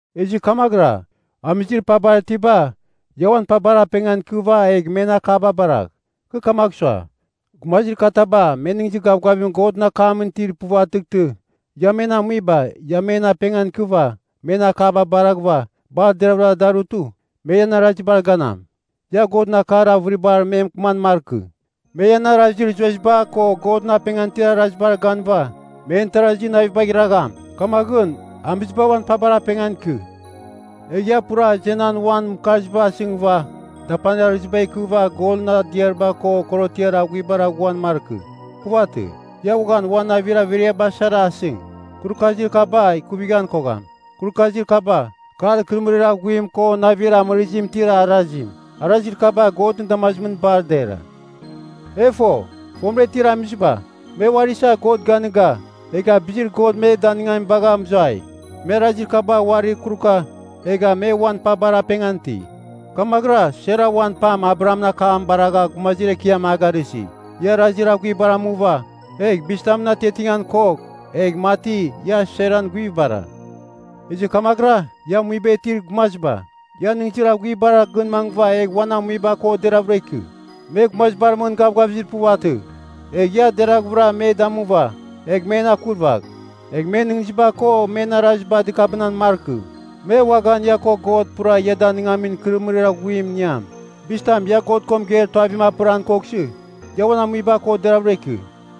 Ezɨ kamaghɨra, amizir pabar itiba ia uan pabar apengan ikɨva egh men akaba baragh. Kɨ kamagh sua, gumazir kataba me nɨghnɨzir gavgavim Godɨn akamɨn itir puvatɨghtɨ, ia men amuiba, ia men apengan ikɨva, men akaba baraghɨva, bar deravɨra darutɨ, me ian arazibar ganam. Ia Godɨn akar avɨribar me mɨkɨman markɨ, me ian arazir zueziba ko Godɨn apengan itir arazibar ganɨva men tarazi navibagh iragham. Kamaghɨn, amiziba uan pabar apengan ikɨ. Egh ia pura azenan uan mɨkarziba asɨngɨva, dapanir arɨziba ikɨva golɨn adiariba ko korotiar aghuibar aghuan markɨ. Puvatɨ. Ia uaghan uan navir averiaba sara asɨng, kurukazir kaba ikuvighan kogham. Kurukazir kaba, kar ikɨrɨmɨrir aghuim ko navir amɨrɨzim itir arazim. Arazir kaba Godɨn damazimɨn bar dera. E fo, fomɨra itir amiziba, me uari isa God ganɨga, egha bizir God me danɨngamim bagha mɨzuai. Me arazir kaba uarir kuruka, egha me uan pabar apengan iti. Kamaghɨra Sara uan pam Abrahamɨn akam baragha “gumazir ekiam” a garɨsi. Ia arazir aghuibar amuva, egh bizitamɨn atiatingan kogh, egh mati ia Saran guivibara. Ezɨ kamaghɨra ia amuiba itir gumaziba, ia nɨghnɨzir aghuibar gɨn mangɨva egh uan amuiba ko deraghvɨra ikɨ. Me gumazibar mɨn gavgavizir puvatɨ. Egh ia deraghvɨra me damuva, egh men akurvagh. Egh men nɨghnɨziba ko men araziba dɨkabɨnan markɨ. Me uaghan ia ko God pura ia danɨngamin ikɨrɨmɨrir aghuim iniam. Bizitam ia God ko mɨgeir tuavim apɨran koghsɨ, ia uan amuiba ko deraghvɨra ikɨ.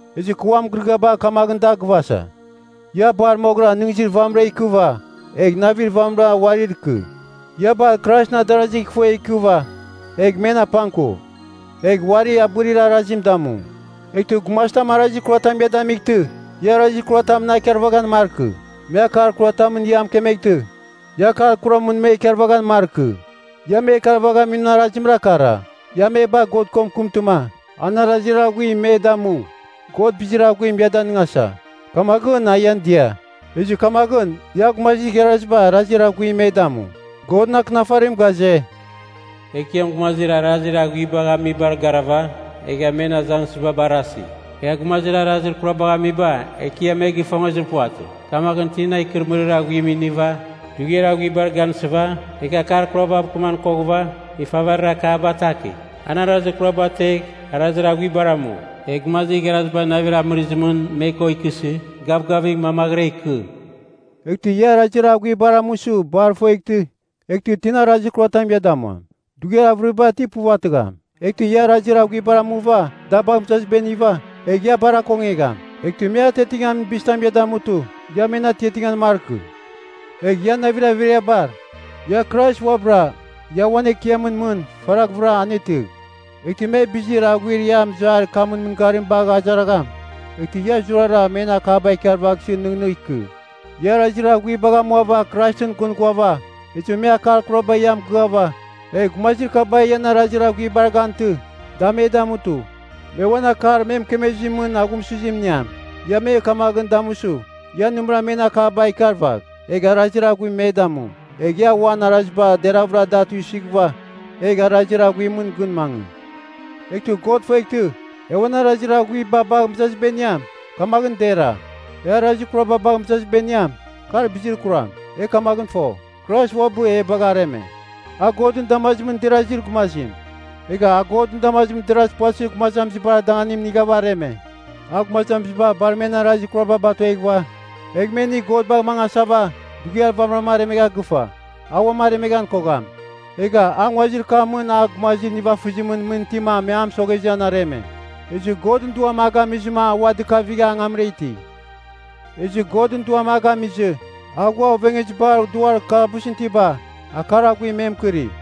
Ezɨ kɨ uan mɨgɨrɨgɨaba kamaghɨn da gɨvasa, ia bar moghɨra nɨghnɨzir vamɨra ikɨva, egh navir vamɨra uarir ikɨ. Ia bar Kraisɨn adarasi ifuegh ikɨva, egh men apangkuv, egh uari abɨrir arazim damu. Eghtɨ gumazitam arazir kuratam ia damightɨ, ia arazir kuramɨn a ikarvaghan markɨ. Me akar kuratamɨn ia mɨkemeghtɨ, ia akar kuramɨn me ikarvaghan markɨ. Ia me ikarvaghamin arazimra kara, ia me bagh God ko mɨkɨmtɨma, an arazir aghuim me damu. God bizir aghuim ia danɨngasa, kamaghɨn a ian dia. Ezɨ kamaghɨn ia gumazir igharaziba arazir aghuim me damu. Godɨn Akɨnafarim ghaze, “Ekiam gumazir arazir aghuibagh amibar garava, egha men azangsɨziba barasi. Egha gumazir arazir kurabagh amiba, Ekiam me gifongezir puvatɨ. Kamaghɨn tina ikɨrɨmɨrir aghuim iniva, dughiar aghuibar gansɨva, egh akar kurabav kɨman koghɨva, ifavarir akaba atakigh. An arazir kuraba ategh, arazir aghuibar amu; egh gumazir igharaziba navir amɨrɨzimɨn me ko ikɨsɨ, gavgavigh mamaghɨra ikɨ.” Eghtɨ ia arazir aghuibar amusɨ bar ifueghtɨ, eghtɨ tina arazir kuratam ia damuam? Dughiar avɨriba ti puvatɨgham. Eghtɨ ia arazir aghuibar amuva da bagh mɨzaziba iniva, egh ia bar akongegham! “Eghtɨ me atiatingamin bizitam ia damutɨ, ia men atiatingan markɨ.” Egh ian navir averiabar, ia Krais uabɨra ia uan Ekiamɨn mɨn faraghvɨra anetɨgh. Eghtɨ me bizir aghuir ia mɨzuair kamɨn mɨngarim bagh azaragham, eghtɨ ia zurara men akaba ikarvaghsɨ nɨghnɨgh ikɨ. Ia arazir aghuibagh amuava Kraisɨn gɨn ghuava, ezɨ me akar kuraba ia mɨgɨava, egh gumazir kaba ian arazir aghuibar gantɨ, da me damutɨ, me uan akar me mɨkemezimɨn aghumsɨzim iniam. Ia me kamaghɨn damusɨ, ia nɨmɨra men akaba ikarvagh, egh arazir aghuim me damu. Egh ia uan araziba deravɨra da tuisɨghɨva egh arazir aghuimɨn gɨn mangɨ. Eghtɨ God ifueghtɨ, e uan arazir aghuiba bagh mɨzaziba iniam, kamaghɨn dera. E arazir kuraba bagh mɨzaziba iniam, kar bizir kuram. E kamaghɨn fo, Krais uabɨ ia bagha areme. A Godɨn damazimɨn derazir gumazim, egha a Godɨn damazimɨn derazir puvatɨzir gumazamizibar danganim inighava areme. A gumazamiziba bar men arazir kuraba batueghɨva egh me inigh God bagh mangasava, dughiar vamɨra aremegha gɨfa. A uam aremeghan kogham. Egha a nguazir kamɨn a gumazir nivafɨzimɨn mɨn itima me a mɨsoghezɨ an areme. Ezɨ Godɨn Duam a gamizɨ a ua dɨkavigha angamra iti. Ezɨ Godɨn Duam a gamizɨ, a ghua ovengezibar duar kalabusɨn itiba, akar aghuim me mɨkɨri.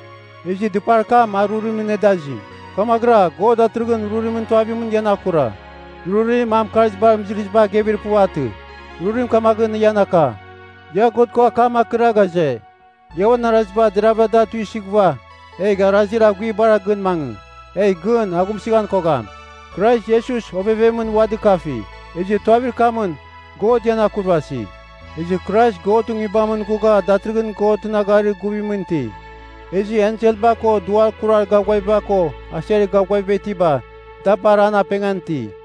Ezɨ dɨpar kam a rurimɨn nedazim, kamaghɨra God datɨrɨghɨn rurimɨn tuavimɨn ian akura. Rurim, a mɨkarzibar mɨzɨrɨziba agevir puvatɨ. Rurim kamaghɨn ian aka, ia God ko akam akɨra ghaze, ia uan araziba deravɨra da tuisɨghɨva, egh arazir aghuibara gɨn mangɨ, egh gɨn aghumsɨghan kogham. Krais Iesus ovevemɨn ua dɨkafi, ezɨ tuavir kamɨn God ian akurvasi. Ezɨ Krais Godɨn Nguibamɨn ghugha datɨrɨghɨn Godɨn agharir guvimɨn iti. Ezɨ enselba ko duar kurar gavgaviba ko aser gavgaviba itiba, da bar an apengan iti.